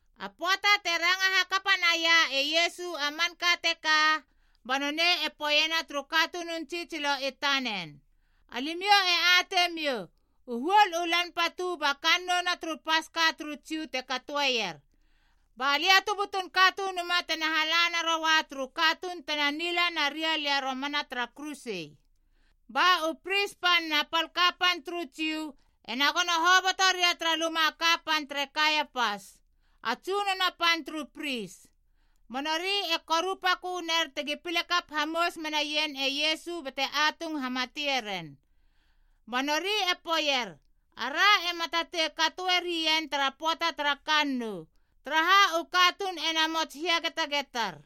A pöata te ranga hakapa naia e Iesu a manka teka, ba nonei e poeiena turu katunun tsitsilo i tanen, “Alimiou e atei miou, u huol u lan patu ba kannouna turu Paska turu Jiu te katoeier. Ba Lia tu butun Katunuma tena hala naroa turu katuun tena nila naria lia romana tara kuruse.” Ba u pris pan na pal kapan turu Jiu ena gono hoboto ria tara luma a kapan tere Kaiapas, a tsunono pan turu pris. Ba nori e korupakö ner tegi pile kap hamous menaien e Iesu bate atung hamatie ren. Ba nori e poeier, “Ara ema tatei katoe rien tara pöata tara kannou, taraha u katuun e namots hiagetagetar.”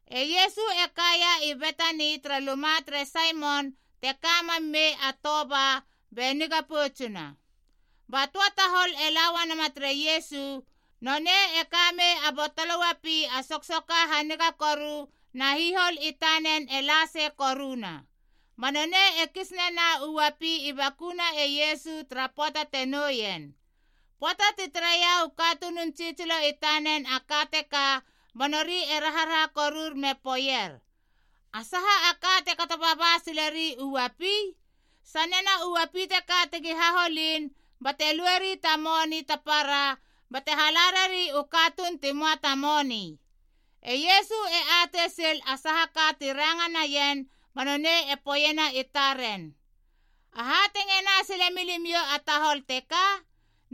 E Iesu e kaia i Betani tara luma tere Saimon te ka mam mei a toba be niga poutsuna. Ba töa tahol e la uanama tere Iesu, nonei e kamei a botolo uapi a soksoka haniga koru na hihol i tanen e la sei koruna. Ba nonei e kis nena u uapi i bakuna e Iesu tara pöata te nouien. Pöata ti tareia u katunun tsitsilo i tanen a ka teka banori e raharaha korur me poeier, “A saha a ka te kato baba sileri u uapi? Sanena u uapi teka tegi haholin, bate lueri ta moni ta para bate hala rari u katuun ti möa ta moni!” E Iesu e atei sil a saha ka ti ranga naien ba nonei e poeiena i taren, “Aha te ngena sile milimiou a tahol teka?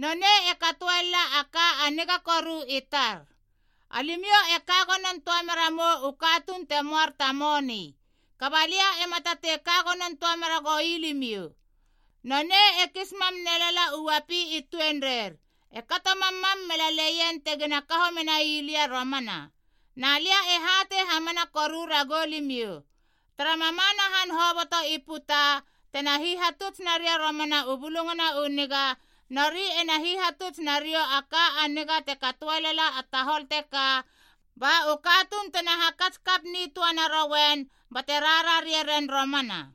Nonei e katoe lala a ka a niga koru i tar. Alimiou e ka gonon töa mera mou u katuun te moar ta moni. Kaba lia ema tatei ka gonon töa mera goi limiou. Nonei e kis mam nelala u uapi i tuenreir, e kato mammam melaleien tegina kaho mei lia romana. Na lia e hatei hamana koru ragou limiou! Tara mamana han hoboto i puta tena hihatuts naria romana u Bulungana u Niga, nori ena hihatuts nariou a ka a niga te katoe lala a tahol teka, ba u katuun tena hakats kap nitöa narouen bate rarare ren romana.”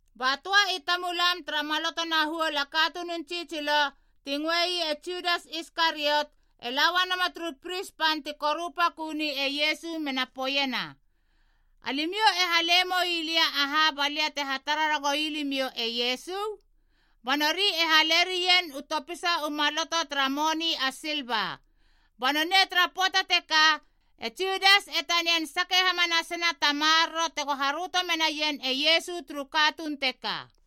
Ba töa i tamulam tara maloto na huol a katunun tsitsilo, ti ngöei e Judas Iskariot, e la uana turu pris pan ti korupaköni e Iesu mena poeiena, “Alimiou e hale moi lia aha ba lia te hatara ragoui limiou e Iesu?” Ba nori e hale rien u topisa u maloto tara moni a silva. Ba nonei tara pöata teka, e Judas e tanian sake hamanasena ta maroro tego haröto menaien e Iesu turu katuun teka.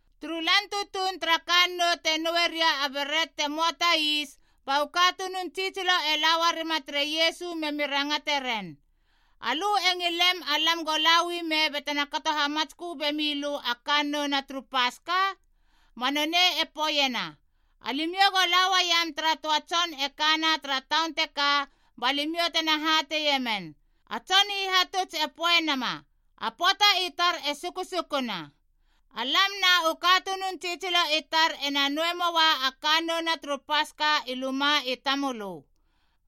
Turu lan tutuun tara kannou te noue ria a beret te möa ta is, ba u katunun tsitsilo i laua rima tere Iesu memi rangate ren, “Alö e ngilem alam go la u ime batena kato hamatskö bemi lö a kannouna turu Paska?” Ba nonei e poeiena, “Alimiou go la uaiam tara töa tson e kana tara taun teka ba limiou tena hateie men, ‘A Tson Hihatuts e poe nama, A pöata i tar e sukusukuna. Alam na u katunun tsitsilo i tar ena noue moa a kannouna turu Paska i luma i tamölö.’”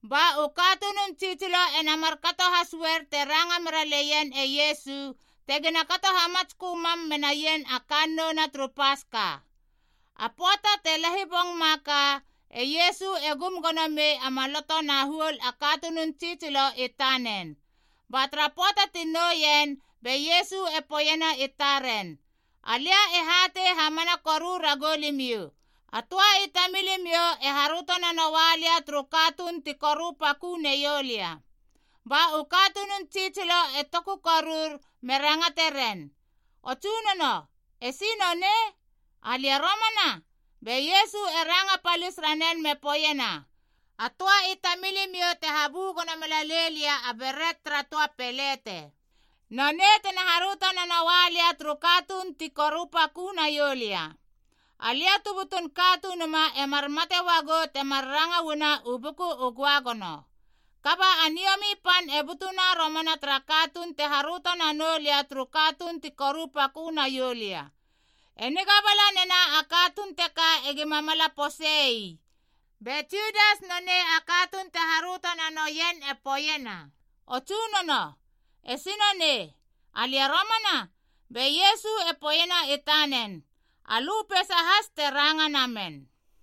Ba u katunun tsitsilo ena markato has uer te ranga mera leien e Iesu, tegina kato hamatskö mam menaien a kannouna turu Paska. A pöata te lahibong ma a ka e Iesu e gum gono mei a maloto na huol a katunun tsitsilo i tanen. Ba tara pöata ti nouien be Iesu e poeiena i taren, “Alia e hatei hamana koru ragou limiou, a töa i tamilimiou e haröto nanoa lia turu katuun ti korupakö neiou lia.” Ba u katunun tsitsilo e toku korur me rangate ren, “O Tsunono, esi nonei? Alia romana?” Be Iesu e ranga palis ranen me poeiena, “A töa i tamilimiou te habu gono melalei lia a beret tara töa pelete, nonei tena haröto nanoa lia turu katuun ti korupakö naiou lia. Alia tu butun Katunuma e mar mate uagou temar ranga uana u Buku u Göagono. Kaba a niomi pan e butuna romana tara katuun te haröto nanou lia turu katuun ti korupakö naiou lia. E niga bala nena a katuun teka egima mala posei.” Be Judas nonei a katuun te haröto nanoien e poeiena, “O Tsunono, esi nonei? Alia romana?” Be Iesu e poeiena i tanen, “Alö peisa has te ranga namen.”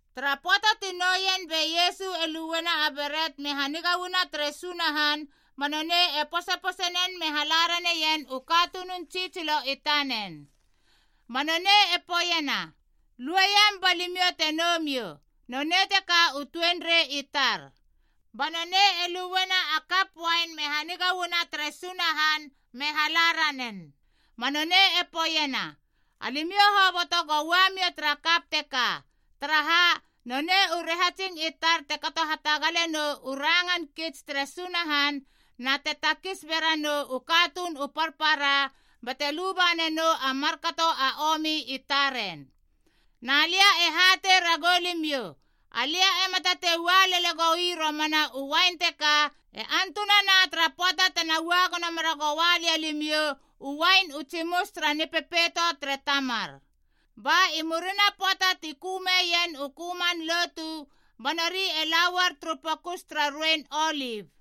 Tara pöata ti nouien be Iesu e luena a beret me haniga uana tere Sunahan ba nonei e posepose nen me hala raneien u katunun tsitsilo i tanen. Ba nonei e poeiena, “Lueiam ba limiou te nou miou. Nonei teka u tuenrei i tar.” Ba nonei e luena a kap uain me haniga uana tere Sunahan me hala ranen. Ba nonei e poeiena, “Alimiou hoboto go ua mia tara kap teka. Taraha, nonei u rahatsing i tar te kato hatagalenou u rangan kits tere Sunahan na te takis bera nou u katuun u parpara bate luba nanou a markato a omi i taren. Na lia e hatei ragou limiou, alia ema tatei ua lele goi romana u uain teka e antunana tara pöata tena ua gono mera goa lia limiou u uain u tsimus tara Nipepeito tere Tamar.” Ba i murina pöata ti kömeien u köman lotu, ba nori e la uar turu Pokus tara Ruein Olip.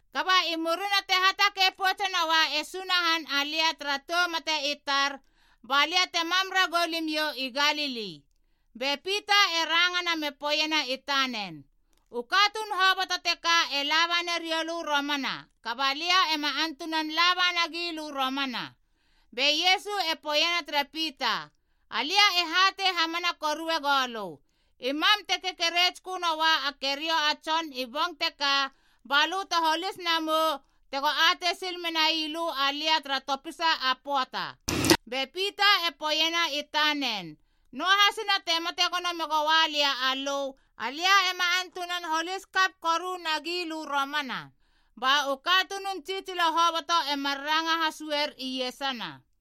“Kaba i murina te hatakei poutse noa e Sunahan alia tara tou mate i tar, balia te mam ragou limiou i Galili.” Be Pita e rangana me poeiena i tanen, “U katuun hoboto teka e laba nariou lö romana, kaba lia ema antunan laba nagilö romana!” Be Iesu e poeiena tere Pita, “Alia e hatei hamana korue goulö, i mam te kekeretskö noa a keriou a tson i bong teka, balö te holis namou tego atei sil menai lö alia tara topisa a pöata.” Be Pita e poeiena i tanen, “Noahasina te mate gono megoa lia alö, alia ema antunan holis kap koru nagilö romana.” Ba u katunun tsitsilo hoboto e mar ranga has uer iesana.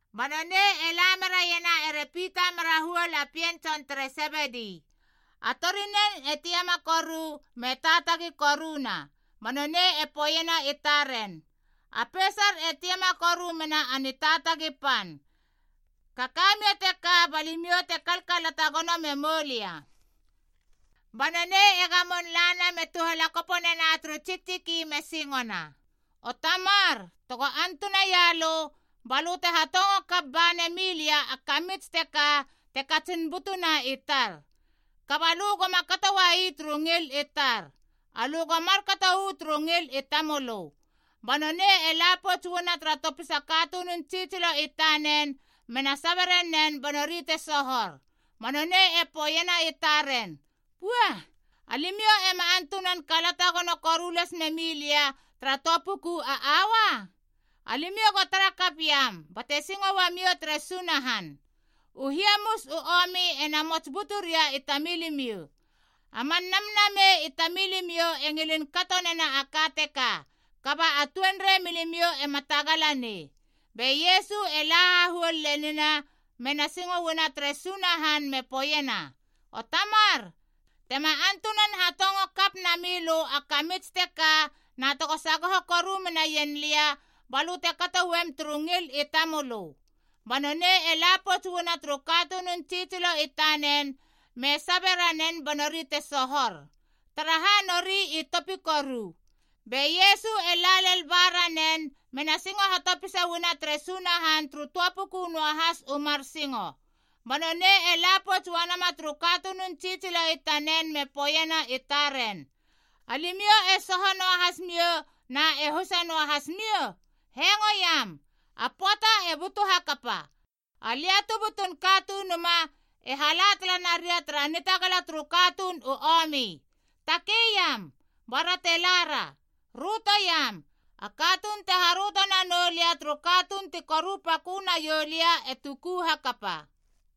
Ba nonei e la meraiena ere Pita mera huol pien tson tere Sebedi, a torinen e tiama koru me taatagi koruna. Ba nonei e poeiena i taren, “A peisar e tiama koru mena a nitaatagi pan. Kaka mia teka ba limiou te kalkalata gono memou lia.” Ba nonei e gamon lana me tuhalakopo nena turu tsiktsiki me singona, “O Tamar, tego antuna ialö, balö te hatongo kap bane milia a kamits teka te katsin butuna i tar. Kaba alö goma kato uai turu ngil i tar. Alö go markato uu turu ngil i tamölö.” Ba nonei e la pouts uana tara topisa katunun tsitsilo i tanen mena sabe ranen ba nori te sohor. Ba nonei e poeiena i taren, “Pua! Alimiou ema antunan kalata gono koru las memi lia tara töa puku a aua? Alimiou go tara kap iam bate singo uamiou tere Sunahan. U hiamus u omi e namots buturia i tamilimiou. A man namnamei i tamilimiou e ngilin kato nena a ka teka, kaba a tuenrei milimiou ema tagala nei.” Be Iesu e la hahuol lenina mena singo uana tere Sunahan me poeiena, “O Tamar, tema antunan hatongo kap nami lö a kamits teka na tego sagoho koru menaien lia, balö te kato uem turu ngil i tamölö.” Ba nonei e la pouts uana turu katunun tsitsilo i tanen me sabe ranen ba nori te sohor, taraha nori i topi koru. Be Iesu e la lel ba ranen mena singo hatopisa uana tere Sunahan turu töa puku noahas u mar singo. Ba nonei e la pouts uana turu katunun tsitsilo i tanen me poeiena i taren, “Alimiou e soho noahas miou na e husa noahas miou? Hengoiam! A pöata e butu hakapa. Alia tu butun Katunuma e hala tala naria tara nitagala turu katuun u omi. Takei iam, ba ra te lara. Rötoiam, a katuun te haröto nanou lia turu katuun ti korupakö naiou lia e tuku hakapa.”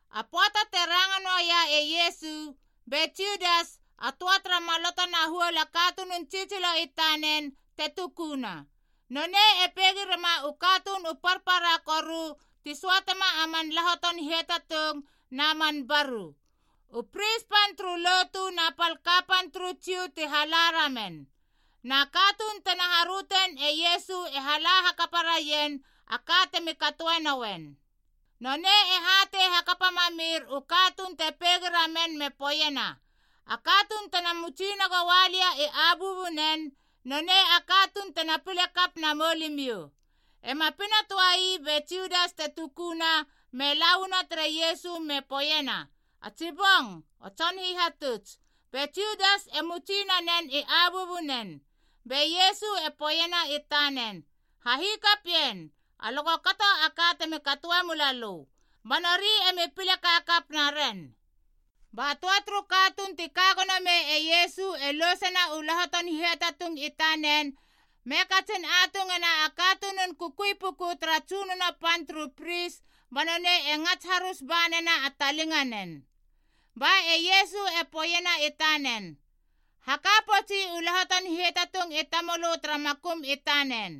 A pöata te ranga noaia e Iesu, be Judas, a töa tara maloto na huol a katunun tsitsilo i tanen, te tukuna. Nonei e peigi rema u katuun u parpara koru ti söatema a man lahoton hiatatung na man baru. U pris pan turu lotu na pal kapan turu Jiu ti hala ramen. Na katuun tena harötein e Iesu e hala hakapa raien a ka temi katoe noen. Nonei e hatei hakapa mamir u katuun te peigi ramen me poeiena, “A katuun tena mutsi nagoa lia i abuabunen, nonei a katuun tena pile kap namou limiou.” Ema pina töa ii be Judas te tukuna me la uana tere Iesu me poeiena, “A tsi bong, o Tson Hihatuts.” Be Judas e mutsi nanen i abuabunen. Be Iesu e poeiena i tanen, “Hahikapien, alö go kato a ka temi katoe mula lö.” Ba nori emi pile kakap naren. Ba töa turu katuun ti ka gono mei e Iesu e lousena u lahoton hiatatung i tanen me katsin atungena a katunun kukui puku tara tsunono pan turu pris ba nonei e ngats harus banena a talinganen. Ba e Iesu e poeiena i tanen, “Haka poutsi u lahoton hiatatung i tamölö tara makum i tanen.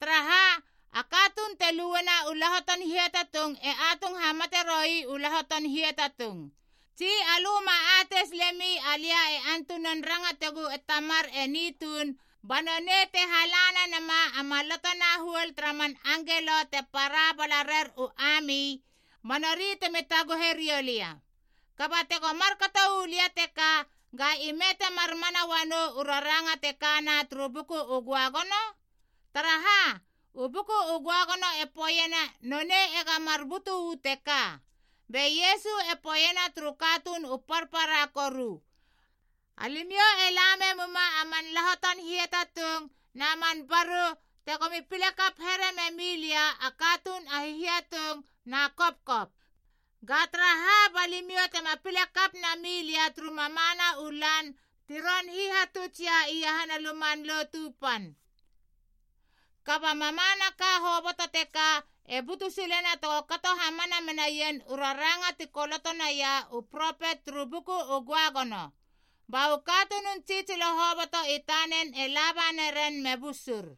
Taraha, a katuun te luena u lahoton hiatatung e atung hamate roi u lahoton hiatatung. Tsi alö ma atei silemi alia e antunan rangategu e Tamar eni tuun ba nonei te hala nanama a maloto na huol tara man angelo te para bala rer u ami ba nori temi taguhe riou lia. Kaba tego markato u lia teka, ga ime temar mana uanou u raranga te kana turu Buku u Göagono? Taraha, u Buku u Göagono e poeiena nonei ega mar butu uu teka.” Be Iesu e poeiena turu katuun u parpara koru, “Alimiou e la memuma a man lahoton hiatatung na man baru tegomi pile kap here memilia a katuun a hihiatung na kopkop. Ga taraha, ba limiou tema pile kap nami lia turu mamana u lan ti ron hihatuts ialia iahana a Luman Lotu Pan. Kaba mamanaka hoboto teka e butu silena tego kato hamana menaien u raranga ti koloto naia u propet turu Buku u Göagono.” Ba u katunun tsitsilo hoboto i tanen e laba naren me busur.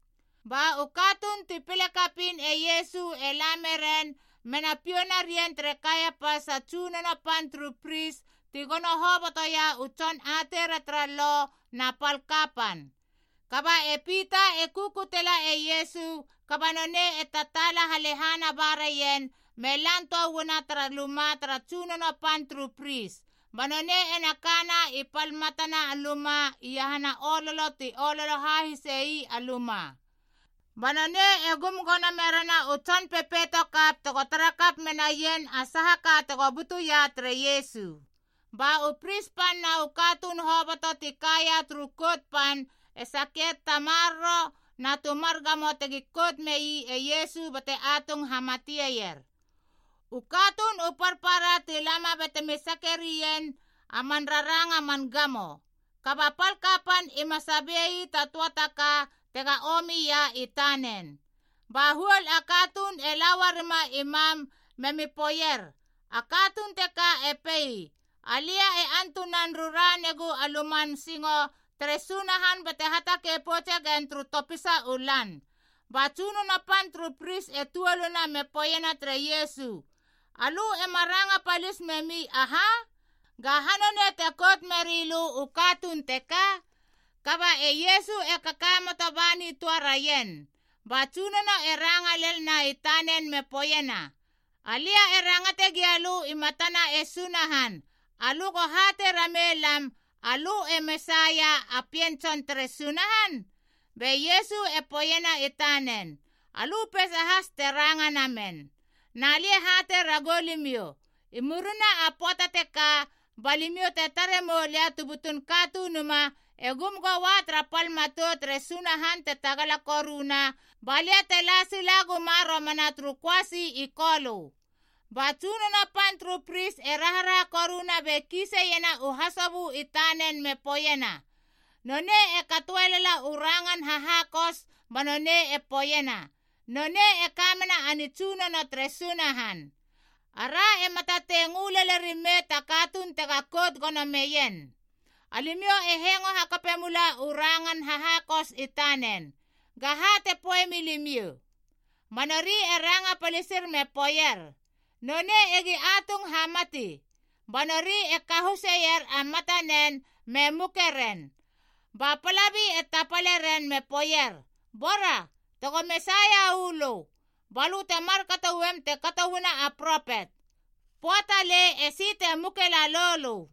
Ba u katuun ti pile kapiin e Iesu e la meren mena piou narien tere Kaiapas a tsunono pan turu pris ti gono hobotoia u tson ateira tara Lo na pal kapan. Kaba e Pita e kukutela e Iesu kaba nonei e tataala halehana ba raien me lan töa uana tara luma tara tsunono pan turu pris, ba nonei ena kana i pal matana a luma iahana ololo ti ololo hahisei a luma. Ba nonei e gum gono merena u tson pepeito kap tego tara kap menaien a saha ka tego butuia tere Iesu. Ba u pris pan na u katuun hoboto ti kaia turu Kout Pan e sakier ta maroro na tu mar gamo tegi kout mei e Iesu bate atung hamateier. U katuun u parpara ti lama batemi sake rien a man raranga man gamo, kaba a pal kapan ima sabei ta töa ka tega omi ia i tanen. Ba huol a katuun e la uarima i mam memi poeier, “A katuun teka e pei, ‘Alia e antunan rura negu a luman singo tere Sunahan bate hatakei poutse gen turu topisa u lan.’” Ba tsunono pan turu pris e tuoluna me poeiena tere Iesu, “Alö ema ranga palis memi aha? Gaha nonei te kout meri lö u katuun teka?” Kaba e Iesu e kakamoto ba nitöa raien. Ba tsunono e ranga lelna i tanen me poeiena, “Alia e rangate gia lö i matana e Sunahan, alö go hatei ramei lam, alö e Mesaia, a Pien Tson tere Sunahan?” Be Iesu e poeiena i tanen, “Alö peisa has te ranga namen. Na lia e hatei ragou limiou, i murina a pöata teka ba limiou te tare mou Lia tu butun Katunuma e gum goa tara pal matou tere Sunahan te tagala koruna, ba lia te la sila guma romana turu köasi i kolö.” Ba tsunono pan turu pris e raharaha koruna be kiise iena u hasobö i tanen me poeiena, “Nonei e katoe lala u rangan hahakus ba nonei e poeiena, nonei e kamena a nitsunono tere Sunahan. Ara ema tatei ngö lele rimei ta katuun tega kout gono meien. Alimiou e hengo hakape mula u rangan hahakus i tanen. Ga ha te poemi limiou?” Ba nori e ranga palisir me poeier, “Nonei egi atung hamati!” Ba nori e kahuseier a matanen me muke ren. Ba palai e tapale ren me poeier, “Bora! Tego Mesaia uu lö, balö te markato uem te kato uana a propet. Poa talei esi te muke lalou lö.”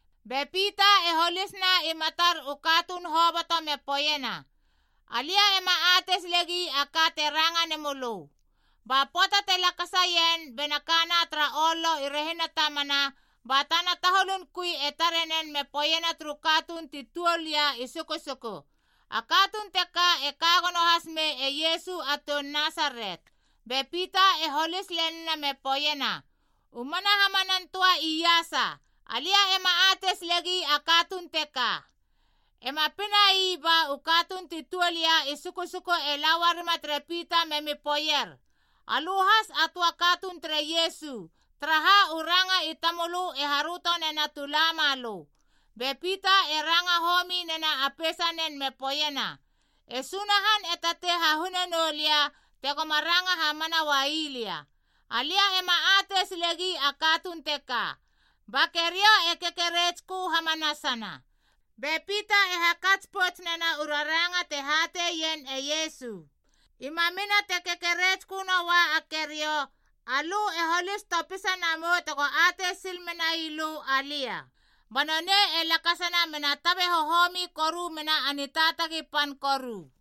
Be Pita e holisna i matar u katuun hoboto me poeiena, “Alia ema atei silegi a ka te ranga nemölö.” Ba pöata te lakasaien bena kana tara ololo i rehina tamana, ba tana taholun kui e tare nen me poeiena turu katuun ti tuol ia i sukusuku, “A katuun teka e ka gono hasmei e Iesu a toun Nasaret.” Be Pita e holis lenina me poeiena, “U mana hamanan töa iasa, alia ema atei silegi a katuun teka.” Ema pinai ba u katuun ti tuol ia i sukusuku e la uarima tere Pita memi poeier, “Alö has a töa katuun tere Iesu, taraha u ranga i tamölö e haröto nena tu la malö.” Be Pita e ranga homi nena a peisanen me poeiena, “E Sunahan e tatei hahune noulia tegoma ranga hamana uai lia. Alia ema atei silegi a katuun teka!” Ba keriou e kekeretskö hamanasana. Be Pita e hakats pouts nena u raranga te hateien e Iesu, “I mamina te kekeretskö noa a keriou alö e holis topisa namou tego atei sil menai lö alia.” Ba nonei e lakasana mena tabe hohomi koru mena a nitaatagi pan koru.